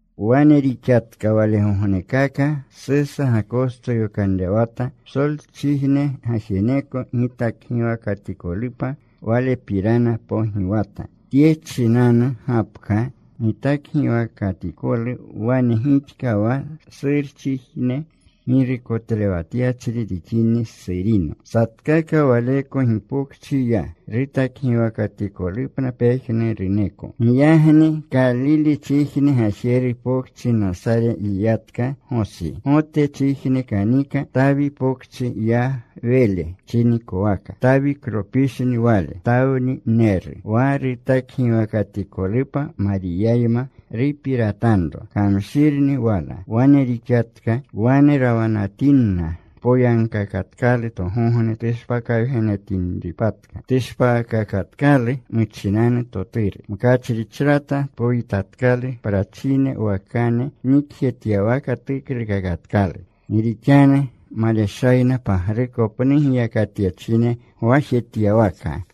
Wane rixatka walegognekaka. Susa Gakosto yokanrewata psolchijne gajeneko gitakgiwakatikolupa. Walepirana pogiwata. Tye muchinanu gapka gitakgiwakatikolu wane gixka wa Surchijne girukotlewatyachri rixini Surino. Satkaka waleko gipokchi ya, rutakgiwakatikolupna pejnuruneko. Giyagni Kalilchijne gajeru pokchi Nasare yiyatka Gosi. Gotchijne kanika. Tawi pokchi ya Wele chinikowaka. Tawiklopishni wale. Tawnineru. Wa rutakgiwakatikolupa Mariyayma rupiratanro. Kamshirni wala. Wane rixatka. Wane rawanatinna tpoyagkakatkalu togogne tushpakawgenetinripatka. Tushpaakakatkalu muchinanu toturu. Mkachrichrata tpoyitatkalu. Prachine wakane nikjetyawaka tuklukakatkalu, gi rixanu maleshayna pagruko pnu giyakatyachine gwajetyawaka.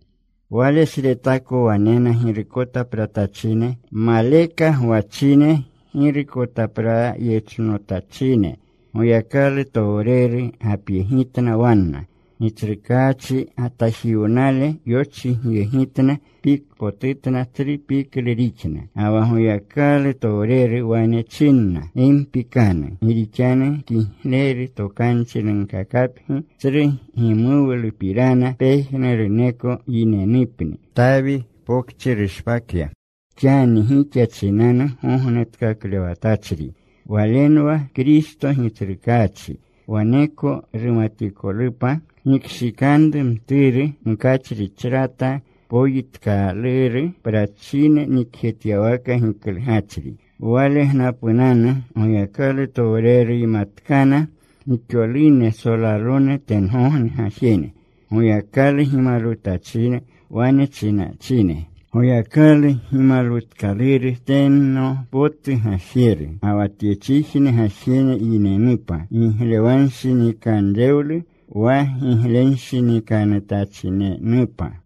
Walesretako wanena girukotapratachine, maleka gwachine, girukotaprayechnotachine. Goyakalutowreru gapyegitna wanna. Gitsrukaachi gatajiwnale yochigyegitna. Pikpotutna. Tsru piklu rixna. Ga wa Goyakalutowreru wane chinna, “Gi mpikanu. Gi rixanu kigleru tokanchi nunkakapgi, tsru gimuwlupirana, pejnuruneko yinenupni. Tawi pokchi rushpakya xani gixa chinanu Gognetkaklewatachri. Walenwa Kristo Gitsrukaachi. Waleko rumatikolupa: Gikshikanru mturu mkachrichrata poyitkaluru; prachine nikjetyawaka giklugachri.” Walegnapunanu Goyakalutowreruymatkana gixolune solalone tengogne gajene. Goyakalu gimalwutachine. Wane chinachine: Goyakalu gimalwutkaluru teno potu Gajeru. Ga wa tyechijne gajene yinenupa giglewanshinikanrewlu, wa giglenshinikanutachinenupa.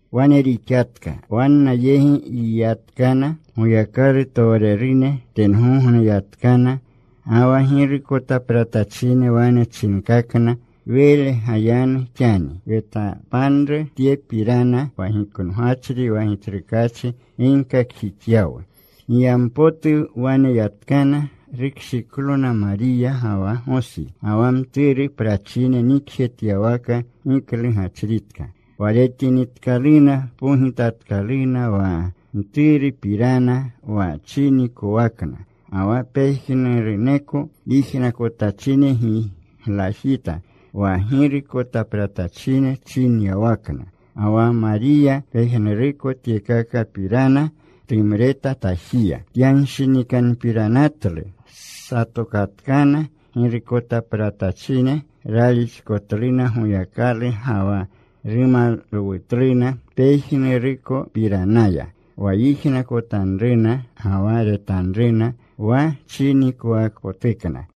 Wane rixatka. Wanna yegi yiyatkana Goyakalutowrerune. Tengogne yatkana. Ga wa girukotapratachine wane chinkakna, “Wele gayanu xani. Wetapanru tyepirana wa giknogachri wa Gitsrukaachi ginkakjixyawu.” Giyampotu wane yatkana. Rukshiklona Mariya, ga wa Gosi, ga wa mturu prachine nikjetyawaka giklugachritka. Wa retinitkaluna, pogitatkaluna wa mturupirana, wa chinikowakna. Ga wa pejnuruneko yijnakotachine giglajita wa girukotapratachine chinyawakna. Ga wa Mariya pejnuruko tyekakapirana tumreta tajiya. Tyanshinikanpiranatlu. Satokatkana girukotapratachine. Ralixkotluna Goyakalu ga wa rumalwutluna pejnurukopiranaya, wa yijnakotanruna ga wa retanruna, wa chinikowakpotukna.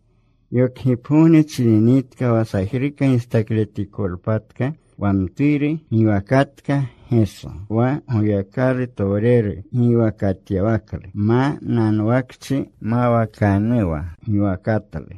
Yokgipgogne chininitka wa sajruka gistakletikolpatka wa mturu, giwakatka Geso, wa Goyakalutowreru giwakatyawaklu, ma nanwakchi mawakanuwa giwakatlu.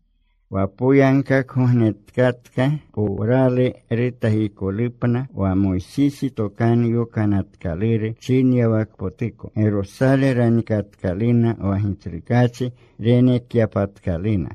Wa poyagkakgognetkatka powralu rutakikolupna, wa Moysisi Tokanu Yokanatkaluru chinyawakpotuko, Gerosale ranikatkaluna, wa Gitsrukaachi renekyapatkaluna.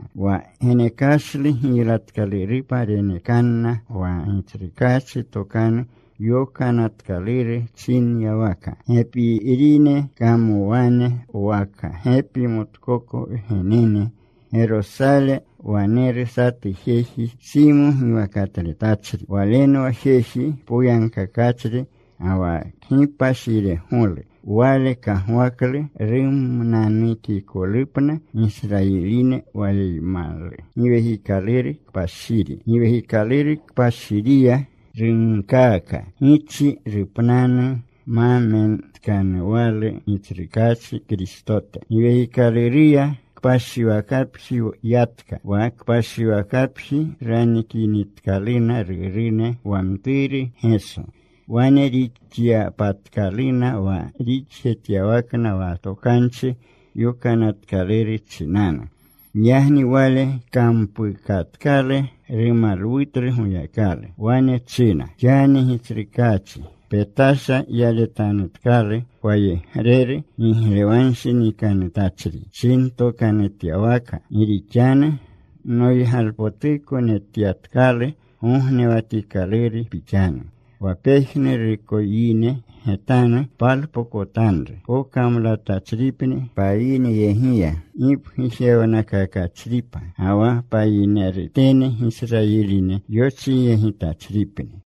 Wa genekashlu giylatkalurupa renekanna wa Gitsrukaachi Tokanu Yokanatkaluru chinyawaka: Gepirine kamowane, waka gepi motkoko wgenene. Gerosale waneru satu jeji, Simo giwakatletachri. Walenwa jeji poyagkakachri ga wa kgipashiregolu. Wale kagwaklu rumnanukikolupna Gisrayiline. Waleymalu Giwekikaluru Kpashiri. Giwekikaluru Kpashiriya runkaaka gichi rupnanu ma metkanuwalu Gitsrukaachi Kristote. Giwekikaluruya kpashiwakapji yatka. Wa kpashiwakapji ranikinitkaluna rurune wa mturu Geso, wane rixyapatkaluna wa rixjetyawakna wa Tokanchi Yokanatkaluru chinanu. Giyagni wale kampukatkalu. Rumalwutlu Goyakalu. Wane china: “Xani, Gitsrukaachi, petasha yaletanutkalu pwayegreru giglewanshinikanutachri pchintokanutyawaka. Gi rixanu noygalpotuko netyatkalu gognewatikaluru Pixanu, Wa pejnuruneko yine getanu palpokotanru. Pokamlatachripni payinyegiya gipgujewnakakachripa. Ga wa payinerutene Gisrayiline yochigyegitachripni.”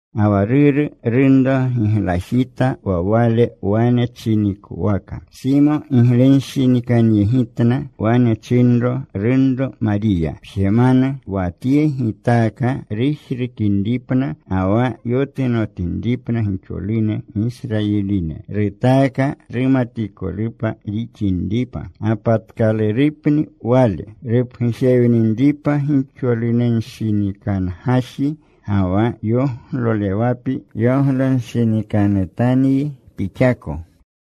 Ga wa ruru, runro giglajita wa wale wane chinikowaka. Simo giglenshinikanyegitna. Wane chinro runro Mariya, “Pjemanu. Wa Tye gitaaka rujrukinripna, ga wa yotunomtinripna gixolune Gisrayiline. Rutaaka rumatikolupa rixinripa. Gapatkalurupni Wale, rupgujewninripa gixolunenshinikangaji. Ga wa yoglolewapi yoglonshinikanutanyi pixako.”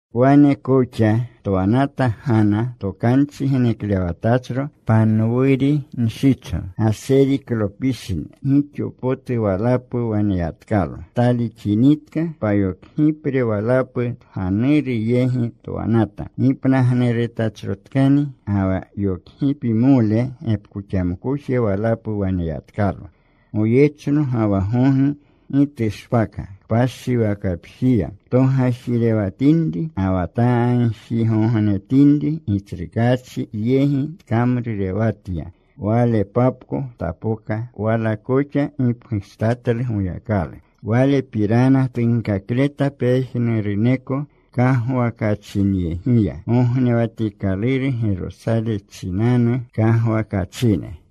Wane koxa twanata Gana, tokanchi geneklewatachro, Panwuri nshicho. Gaseriklopishni. Gixo potu walapu waneyatkalo. Talixinitka, payokgipre walapu tganuru yegi twanata. Gipnagnurutachrotkani, ga wa yokgipimole gepkoxamkoje walapu waneyatkalo. Goyechno ga wa gogi gi tushpaka kpashiwakapjiya. Togajirewatinri ga wa tagjigognetinri Gitsrukaachi yegi tkamrurewatya. Walepapko tapoka. Wala koxa gipgujtatlu Goyakalu. Walepirana tunkakleta pejnuruneko kagwakachinyegiya, gognewatikaluru Gerosale chinanu kagwakachine.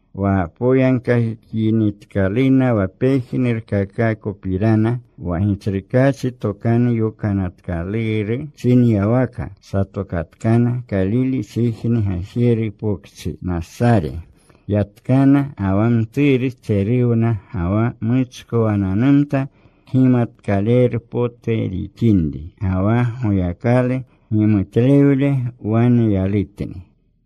Wa poyagkakinitkaluna wa pejnurkakakopirana wa Gitsrukaachi Tokanu Yokanatkaluru chinyawaka, satokatkana. Kalilechijne gajeru pokchi, Nasare, yatkana. Ga wa mturu tseruwna. Ga wa muchkowananumta. Kgimatkaleru potu rixinri. Ga wa Goyakalu gimutlewle waneylutni.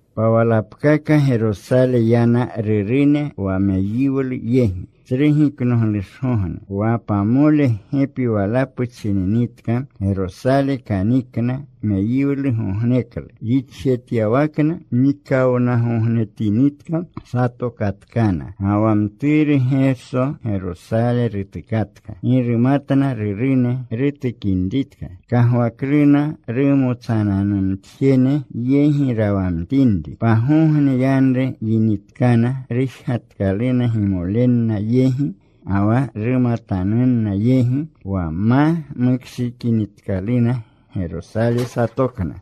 Pawalapkaka Gerosale yana rurune, wa meyiwlu yegi, Tsru Giknoglushgogne. Wa pamole gepi walapu chininitka, Gerosale kanikna meyiwlugogneklu, rixjetyawakna. Nikawnagognetinitka, satokatkana. Ga wa mturu Geso Gerosale rutukatka. Gi rumatna rurune rutukinritka. Kagwakluna rumotsananumtjene yegi rawamtinri. Pagogne yanru yinitkana, rujgatkaluna gimolenna yegi ga wa rumatanunna yegi. Wa ma mukshiikanutkaluna, Gerosale satokna.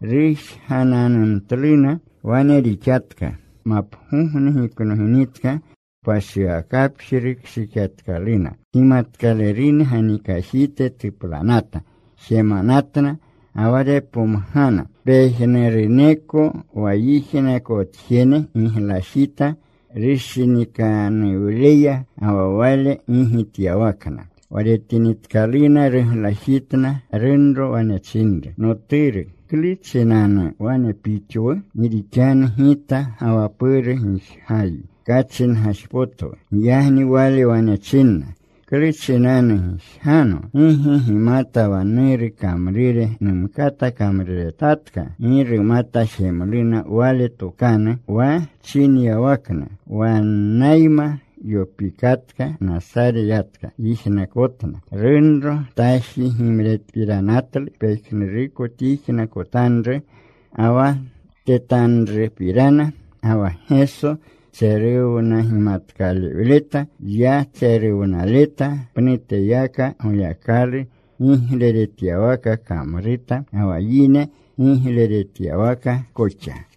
Rujgananumtluna. Wane rixatka. Mapgogne giknoginitka, kpashiwakapji rukshikyatkaluna. Kgimatkalerune ganikajite tuplanata. Jemanatna, ga wa repomgana. Pejnuruneko wa yijnakotjene giglajita rushinikanuwleya ga wa Wale gigityawakna. Wa retinitkaluna, ruglajitna. Runro wane chinru, “Noturu, ¿klu chinanu wane pixwu? Gi rixanu, gita ga wa puru gijgayi. Kachingajpotwu.” Giyagni Wale wane chinna, “¿Klu chinanu gijgano? ¿Gi ge gimata wa Nuru kamrure numkata kamruretatka?” Gi rumata jemluna wale tokanu wa chinyawakna. Wannayma yopikatka. Nasare yatka. Yijnakotna. Runro taji gimretpiranatlu pejnuruko tyijnakotanru ga wa tetanrupirana. Ga wa Geso tseruwnagimatkalewleta. Ya tseruwnaleta. Pnuteyaka Goyakalu gigleretyawaka kamruta, ga wa yine gigleretyawaka koxa.